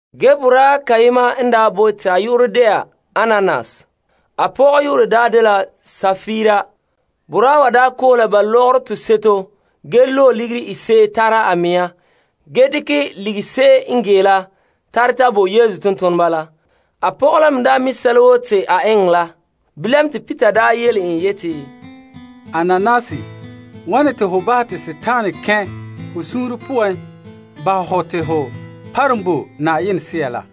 Ge boraa kayema n daa boe te a yu'urɛ dɛna Ananias. A pɔga yu'urɛ dela Sapira. Boraa wa daa koohe la ba lɔgɔrɔ toseto ge loe ligiri i se i tara a mea, ge dekɛ ligise'a n gee la tare ta bo Yesu tontoneba la. A pɔga la me daa mi' sɛla woo te a eŋɛ la. Bilam te Peter yele en yeti, Ananias, wane te ho bahɛ te Dima la kɛn' ho suunre poan bahɛ hɔ te ho parom bo Yenɛ Sea la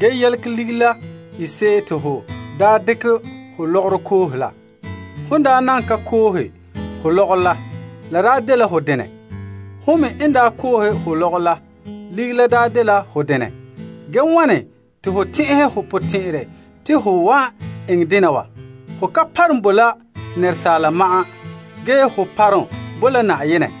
ge yelege ligiri la ise'e te ho daa dekɛ ho lɔgɔrɔ koohe la? Hon daa nan ka koohe ho lɔgɔrɔ la, la daa dela ho denɛ. Hon me n daa koohe ho lɔgɔrɔ la, ligiri la daa dela ho denɛ. Ge wane te ho tɛn'ɛhɛ ho potɛn'ɛrɛ te hon wan eŋɛ dena wa. Ho ka parom bo la nɛreba ma'an ge ho parom bo la Yenɛ.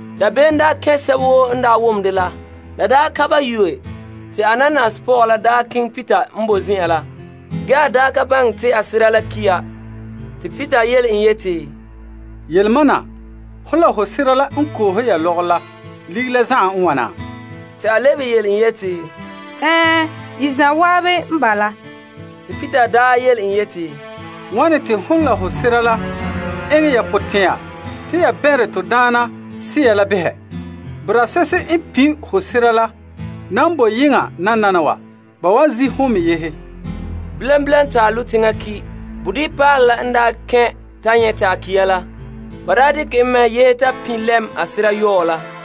La ka ba yuue te Ananias pɔga la keŋɛ Peter n boe zen'en la. Ge a ka baŋɛ te a sera la ki' ya. Te Peter yele en yeti, Yele mam na, hon la ho sera la n koohe ya lɔgɔrɔ la, ligiri la zan'an n wana? Te a lebehe yele en yeti, Ɛɛn, i zan'an n bala. Te Peter yele en yeti, Wane te hon la ho sera la eŋɛ ya potɛn'ɛra te ya bɛnrɛ to Daana Sea la behɛ? Boraa se'ehe n pin' ho sera la nan bo yeŋa nananawa. Ba wan zi' hon me yehe. Bilam bilam te a lu' teŋa ki'. Bodibinpaalehe la n kɛn' ta nyɛ' te a ki' ya la, ba dekɛ en mɛ yehe ta pin' n lɛm a sera yɔ la.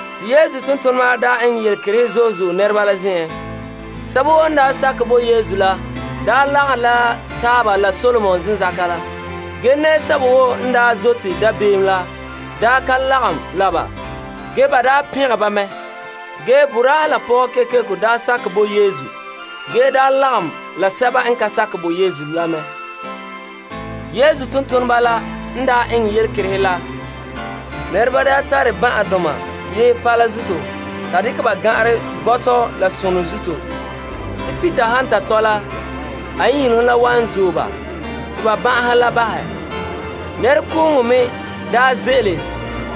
Te Yesu tontoneba la daa eŋɛ yelekerehe zo'e zo'e nɛreba la zen'an. Sɛba woo n sakɛ bo Yesu la lagahere taaba la Solomon Zenzaka. Nɛresɛba woo n zote dabeem la ka lagom la ba ge ba na'aha ba. Boraahe la pɔgɔhe kekeko sakɛ bo Yesu ge lagom la sɛba n sakɛ bo Yesu la mɛ. Yesu tontoneba la n eŋɛ yelekerehe la, nɛreba tare ban'ahedoma yehe pala zuto ta dekɛ ba gan'anrɛ gɔtɔ la sonɔ zuto te Peter han ta tɔla a yilinyiliŋɔ wan zoo ba te ba ban'ahe la bahɛ. Nɛrekooŋɔ me ze'ele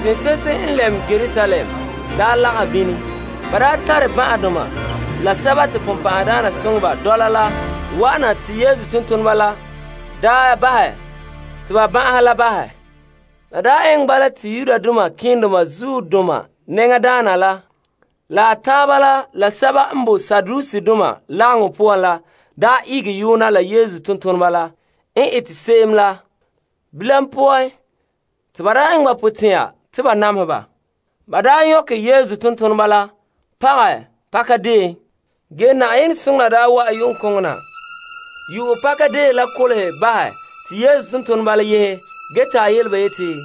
teŋse'ehe n lɛm Yerusalem, a lagahɛ bini. Ba tare ban'ahedoma la sɛba te bonbɛ'ɛhe dɔla la wa'ana te Yesu tontoneba la bahɛ te ba ban'ahe la daa bahɛ. La daa eŋɛ bala te malema nɛŋadaana la a taaba la sɛba n bo Saduseedoma lagaŋɔ poan la ihege nyuuna la Yesu tontoneba la n ete se'em la. Bilam poan, te ba eŋɛ ba potɛn'ɛra te ba namehe ba. Ba nyɔkɛ Yesu tontoneba la pagɛ pakadeen. Ge Na'ayenɛ soŋora wa'an yu'uŋkoŋɔ na yu'ɛ pakadeen la kolehe ge bahɛ te Yesu tontoneba la yehe ge te a yele ba yeti,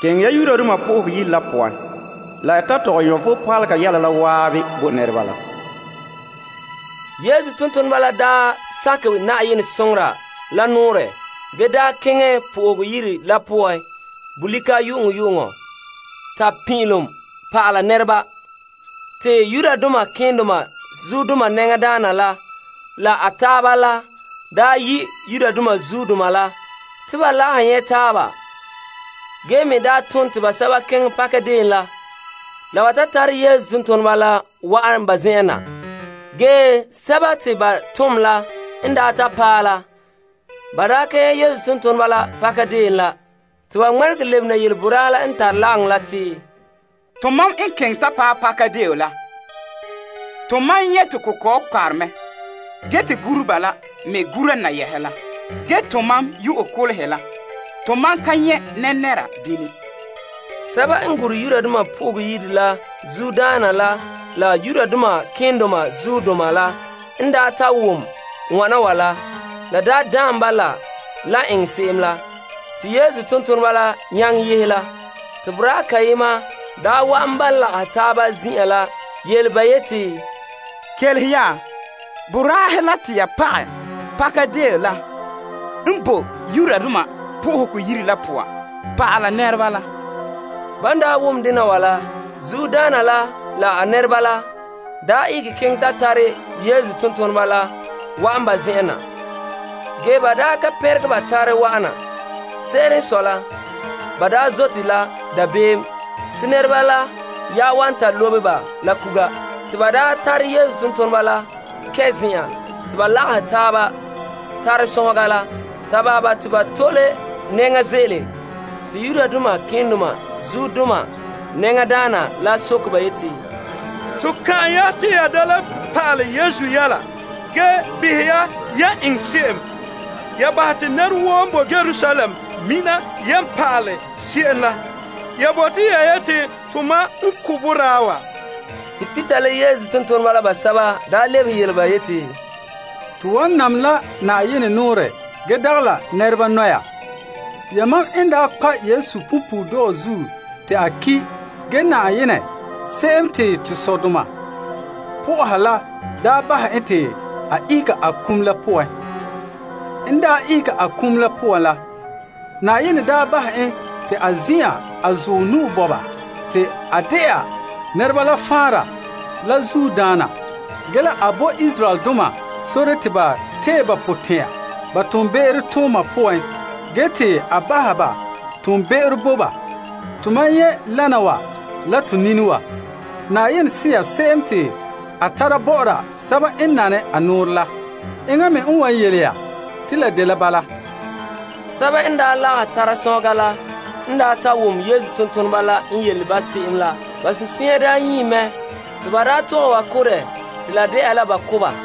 Keŋɛ ya Yenɛ Yire la poan la ya ta tɔgɛ vom yɛla la zan'an bo nɛreba la. Yesu tontoneba n wom Na'ayenɛ soŋora la nɔɔrɛ ge te ba keŋɛ Yenɛ Yire la poan bolika yu'uŋyu'uŋɔ ta pin'ilom pa'ala nɛreba. Te malema nɛŋadaana la la a taaba la yi' Yudoma zuodoma la Yetɔgom Tɔgɔrɔba la zan'an, ge ton te basɛba keŋɛ pakadeen la, la ba ta tare Yesu tontoneba la wa'an ba zen'en na. Ge sɛba te ba ton la n daa ta paɛ la, ba ka nyɛ' Yesu tontoneba la pakadeen la, te ba ŋmɛregɛ lebena yele Yetɔgom Tɔgɔrɔba la te, Tomam n keŋɛ ta paɛ pakadeen la, tomam nyɛ' te ko kɔ'ɔn kpare mɛ ge te guruba la me gura nayahe la. Ge tomam yu'ɛ kolehe la, tomam ka nyɛ' nɛnɛra bini. Sɛba n gura Yenɛ Yire la zuodaana la malema keendoma la n daa ta wom wana wa la, la daan ba la eŋɛ se'em te Yesu tontoneba la nyaŋɛ yehe la. Ge boraa kayema wa'an ban lagahɛ taaba zen'en la yele ba yeti, Kelehe ya, boraahe la te ya pagɛ pakadeen la n boe Yenɛ Yire la poan pa'ala nɛreba la. Ban wom dena wa la, zuodaana la la a nɛreba ihege keŋɛ ta tare Yesu tontoneba la wa'an ba zen'en na. Ge ba ka pɛnregɛ ba tare wa'an na. Se'ere n sɔe la, ba zote la dabeem te nɛreba la ta lobe ba la kuga. Ban daa tare Yesu tontoneba la kɛn' zen'an te Yetɔgom Tɔgɔrɔba laganɔ la, ba bahɛ ba te ba tole nɛŋa ze'ele te malema nɛŋadaana la soke ba yeti, To kan'an ya te ya da le pa'alɛ Yesu yɛla ge behe ya yan eŋɛ se'em. Ya bahɛ te nɛreba woo n boe Yerusalem mina yan pa'alɛ se'em la. Ya bote ya yete te tomam n ko' boraa wa. Ge Peter la Yesu tontoneba la basɛba lebehe yele ba yeti, To wa nam la Yenɛ nɔɔrɛ ge dagɛ la nɛreba nɔya. Yamam n daa kpa' Yesu punpuuredɔɔ zuo te a ki' ge Yenɛ se'em te to sɔdoma soha la daa bahɛ en te a ihege a kum la poan. N daa ihege a kum la poan la, Yenɛ daa bahɛ en te a zin'an a zuɔ nu'o bɔba te a de'a nɛreba la faanra la zuodaana ge la a bo Israeldoma sore te ba tee ba potɛn'ɛra ba toonbe'erotooma poan ge te a bahɛ ba toonbe'ero bo ba. Tomam nyɛ' wana wa la to nini wa. Yenɛ Sea se'em te a tara bɔ'ɔra sɛba n nane a nɔɔrɛ la, enŋa me wan yele ya te la dela bala. Yetɔgom Tɔgɔrɔba la n daa wom Yesu tontoneba la n yele ba se'em la, ba sunsunya nyie mɛ te ba tɔgɛ wa ko' de te la dela ba ko' ba.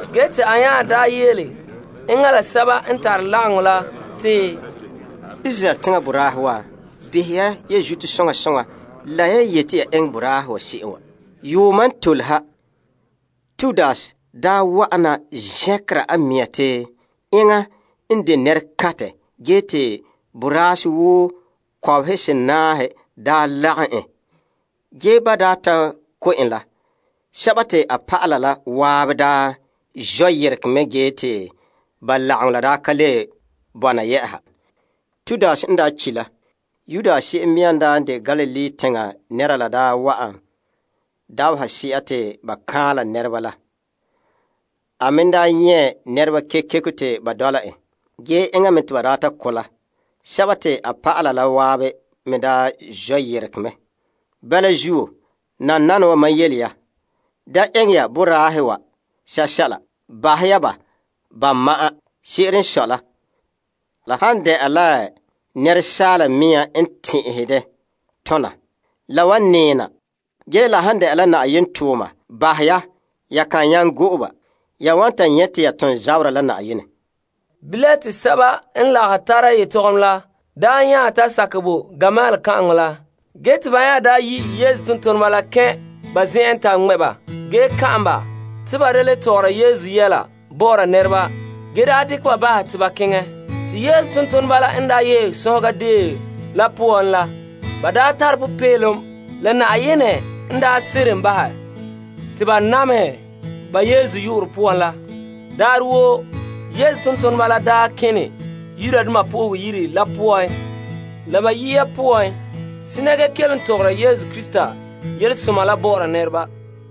Te a nya yele Yetɔgom Tɔgɔrɔba la te, Israel teŋa boraahe wa, behe ya ya zuto soŋa soŋa la yan yete ya eŋɛ boraahe wa se'em wa. Yuuma n tole ha, Teudas daa wa'an na zɛnkera a mea te enŋa dela nɛrekantɛ ge te boraahe wo kɔbehe senaahe daa lagom en. Ge ban daa ta ko' en la, sɛba te a pa'ala la zan'an daa zɔ' yeregɛ mɛ ge te ba lagaŋɔ la daa ka le bɔna yɛ'ɛha. Yudas me, se'em n mea daa de Galilee teŋa nɛra la daa wa'an dabahese'a te ba daa kaanlɛ nɛreba la. A me daa nyɛ' nɛreba kekeko te ba dɔla en, ge enŋa me te ba daa ta ko' la, sɛba te a pa'ala la zan'an me daa zɔ' yeregɛ mɛ. Bala zuo, nananawa, mam yele ya, da eŋɛ ya boraahe wa sɛla. Bahɛ ya ba ba ma'an. Se'ere n sɔe la la han de'a la asaala mea n tɛn'ɛhɛ de tona, la wan nɛɛ na. Ge la han de'a la Yenɛ tooma, bahɛ ya, ya kan nyaŋɛ go'e ba. Ya wan ta nyɛ' de ya ton zabera la Yenɛ. Bilam te Yetɔgom Tɔgɔrɔba la nya ta sakɛ bo Gamaliel kan'aŋɔ la. Ba nya yi' Yesu tontoneba la kɛn' ba zen'en ta ŋmɛ' ba ge kan'an ba te ba da le yɛ'ɛha tɔgɔra Yesu yɛla bɔ'ɔra nɛreba ge daa dekɛ ba bahɛ te ba keŋɛ. Te Yesu tontoneba la n yehe Yetɔgom Tɔgɔrɔba zen'an la poan la, ba tara popeelom. La Na'ayenɛ n seren bahɛ te ba namehɛ ba Yesu yu'urɛ poan la. Daarɛ woo Yesu tontoneba kene Yenɛ Yire la poan la ba yiya poan sina ge kelom tɔgɔra Yesu Krista Yelesoma la bɔ'ɔra nɛreba.